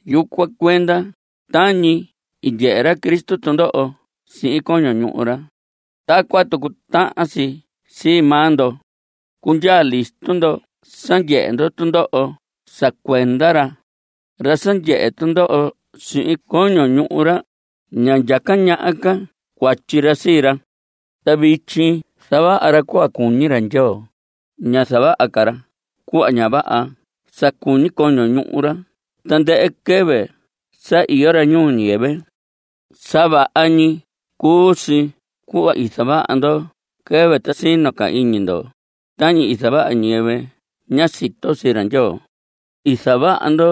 Yucuan cuenda, tañi i ndyehe ra Cristo tundoho sihin coño ñuhu ra, tacuan tucu tahan si sii maa ndo. Cundyaa listo ndo sa ndyehe ndo tundoho sa cuenda ra. Ra sa ndyehe tundoho sihin coño ñuhu ra, ña ndyaca ñaha ca cuatyi ra sii ra. Ta vityi zavaha ra cuhva cuñi ra Ndyoo. Ña zavaha ca ra cuhva ña vaha sa cuñi coño ñuhu ra tandɨhɨ quɨvɨ sa iyo ra ñuu ñiyɨvɨ. Sa vaha ñi cuu si cuhva i zavaha ndo quɨvɨ ta sino ca iñi ndo, tañi zavaha ñiyɨvɨ ña sito sii ra Ndyoo. I zavaha ndo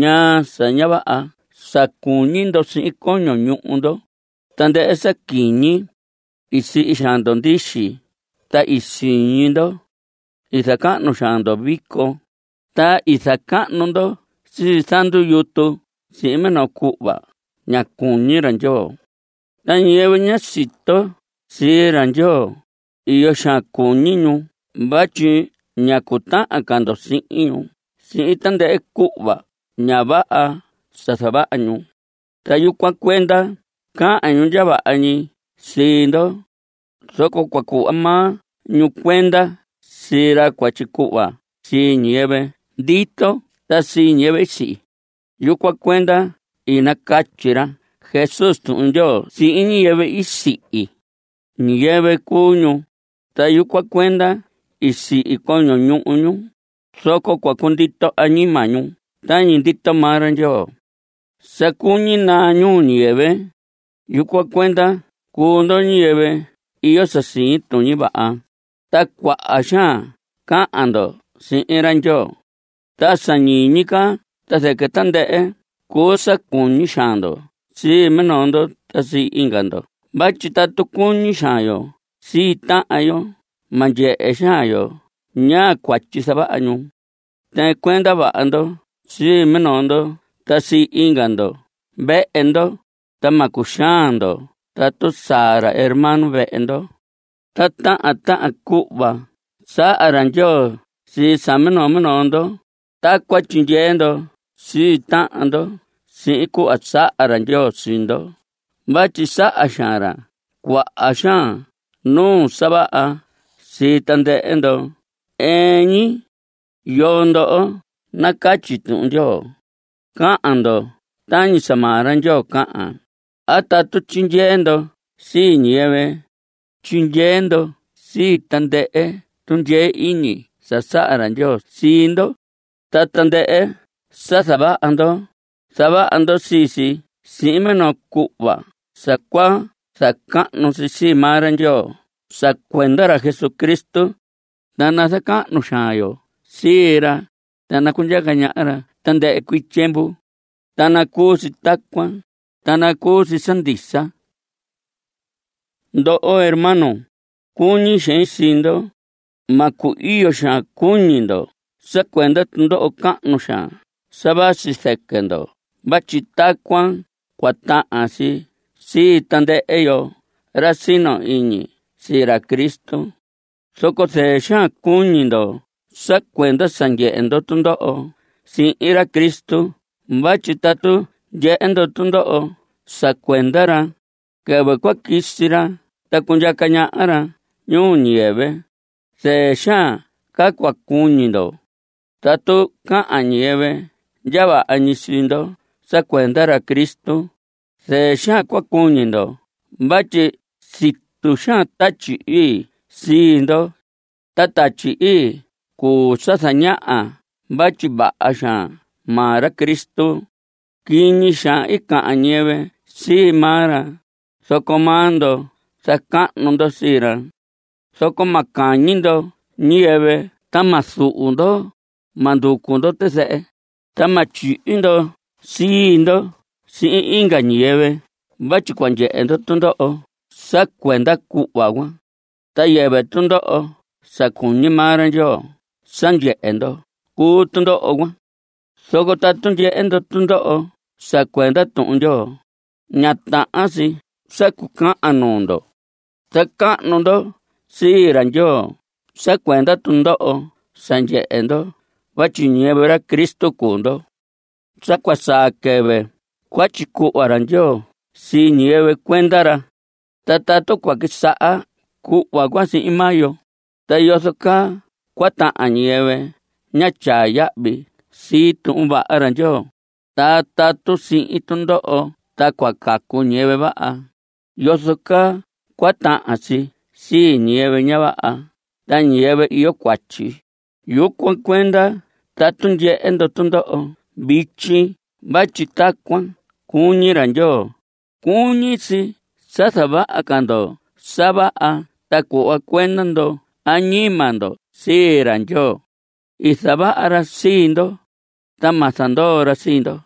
ñaa sa ña vaha sa cuñi ndo sihin coño ñuhu ndo, tandɨhɨ sa quiñi. I sihi xaan ndo ndixi ta i siñi ndo. I zacahnu xaan ndo vico, ta i zacahnu ndo sii zandu yutu sihin minoo cuhva ña cuñi ra Ndyoo. Ta ñiyɨvɨ ña sito sii ra Ndyoo, iyo xaan cuñi ñu vatyi ña cutahan ca ndo sihin ñu sihin tandɨhɨ cuhva ña vaha sa zavaha ñu. Ta yucuan cuenda cahan ñu ndya vaha ñi sii ndo. Zoco cua cuhva maa ñu cuenda sii ra cua tyicuhva sii ñiyɨvɨ ndito ta sii ñiyɨvɨ i sihi. Yucuan cuenda i nacatyi ra Jesús Tuhun Ndyoo sihin ñiyɨvɨ i sihi. Ñiyɨvɨ cuu ñu, ta yucuan cuenda i sihi coño ñuhu ñu, zoco cua cundito añima ñu tañi ndito maa ra Ndyoo. Sa cuñi naa ñuu ñiyɨvɨ. Yucuan cuenda cuu ndo ñiyɨvɨ iyo sa siñi tuñi vaha, ta cuaha xaan cahan ndo sihin ra Ndyoo. Ta sa ñiñi ca ta zɨquɨ tandɨhɨ cuu sa cuñi xaan ndo sii minoo ndo ta sii inga ndo vatyi tatu cuñi xaan yo sii tahan yo ma ndyehe xaan yo ñaa cuatyi zavaha ñu. Tɨɨn cuenda vaha ndo sii minoo ndo ta sii inga ndo vehe ndo, ta ma cuxaan ndo tatu saa ra hermano vehe ndo. Ta tahan tahan cuhva saha ra Ndyoo sii sa minoo minoo ndo, tacuan tyindyee ndo sii tahan ndo sihin cuhva saha ra Ndyoo sii ndo vatyi saha xaan ra cuaha xaan nuu sa vaha sii tandɨhɨ ndo ɨɨn ñi. Yoo ndo nacatyi Tuhun Ndyoo, cahan ndo tañi sa maa ra Ndyoo cahan, a tatu tyindyee ndo sii ñiyɨvɨ, tyindyee ndo sihin tandɨhɨ tundyee iñi sa saha ra Ndyoo sii ndo. Ta tandɨhɨ sa zavaha ndo, zavaha ndo sii si sihin minoo cuhva sa cua zacahnu sii maa ra Ndyoo sa cuenda ra Jesucristo. Ta nazacahnu xaan yo sii ra, ta nacundyaca ñaha ra tandɨhɨ cuii tyiemvu. Ta nacuu si tacuan, ta nacuu si sa ndisa. Ndoho hermanos, cuñi xein sii ndo. Ma cu‑iyo xaan cuñi ndo sa cuenda tundoho cahnu xaan sa vasi zɨquɨ ndo vatyi tacuan cua tahan si sii tandɨhɨ yo ra sino iñi sii ra Cristo. Zoco zɨɨ xaan cuñi ndo sa cuenda sa ndyehe ndo tundoho sihin ra Cristo vatyi tatu ndyehe ndo tundoho sa cuenda ra, quɨvɨ cua quisi ra ta cundyaca ñaha ra ñuu ñiyɨvɨ, zɨɨ xaan ca cua cuñi ndo. Tatu cahan ñiyɨvɨ ndya vaha ñi sii ndo sa cuenda ra Cristo, zɨɨ xaan cua cuñi ndo vatyi situ xaan Tatyi Ii sii ndo. Ta Tatyi Ii cuu sa zañaha vatyi vaha xaan maa ra Cristo. Quiñi xaan cahan ñiyɨvɨ sii maa ra, zoco maa ndo zacahnu ndo sii ra. Zoco ma cahñi ndo ñiyɨvɨ ta ma zuhu ndo; ma nducu ndo tizɨhɨ, ta ma tyihi ndo sii ndo sihin inga ñiyɨvɨ vatyi cua ndyehe ndo tundoho sa cuenda cuhva cuan. Ta yɨvɨ tundoho sa cuñi maa ra Ndyoo sa ndyehe ndo cuu tundoho cuan. Zoco tatu ndyehe ndo tundoho sa cuenda Tuhun Ndyoo, ña tahan si sa cucahan nuu ndo. Zacahnu ndo sii ra Ndyoo sa cuenda tundoho sa ndyehe ndo vatyi ñiyɨvɨ ra Cristo cuu ndo. Sa cua saa quɨvɨ cua tyicuhva ra Ndyoo sii ñiyɨvɨ cuenda ra. Ta tatu cua quisaha cuhva cuan sihin maa yo, ¿ta yozo caa cua tahan ñiyɨvɨ ñá tyaa yahvi sii Tuhun Vaha ra Ndyoo? Ta tatu sihin tundoho ta cua cacu ñiyɨvɨ vaha, ¿yozo caa cua tahan si sii ñiyɨvɨ ña vaha ta ñiyɨvɨ iyo cuatyi? Yucuan cuenda tatu ndyehe ndo tundoho vityi vatyi tacuan cuñi ra Ndyoo, cuñi si sa zavaha ca ndo sa vaha ta cuhva cuenda ndo añima ndo sii ra Ndyoo. I zavaha ra sii ndo, ta ma zandoo ra sii ndo.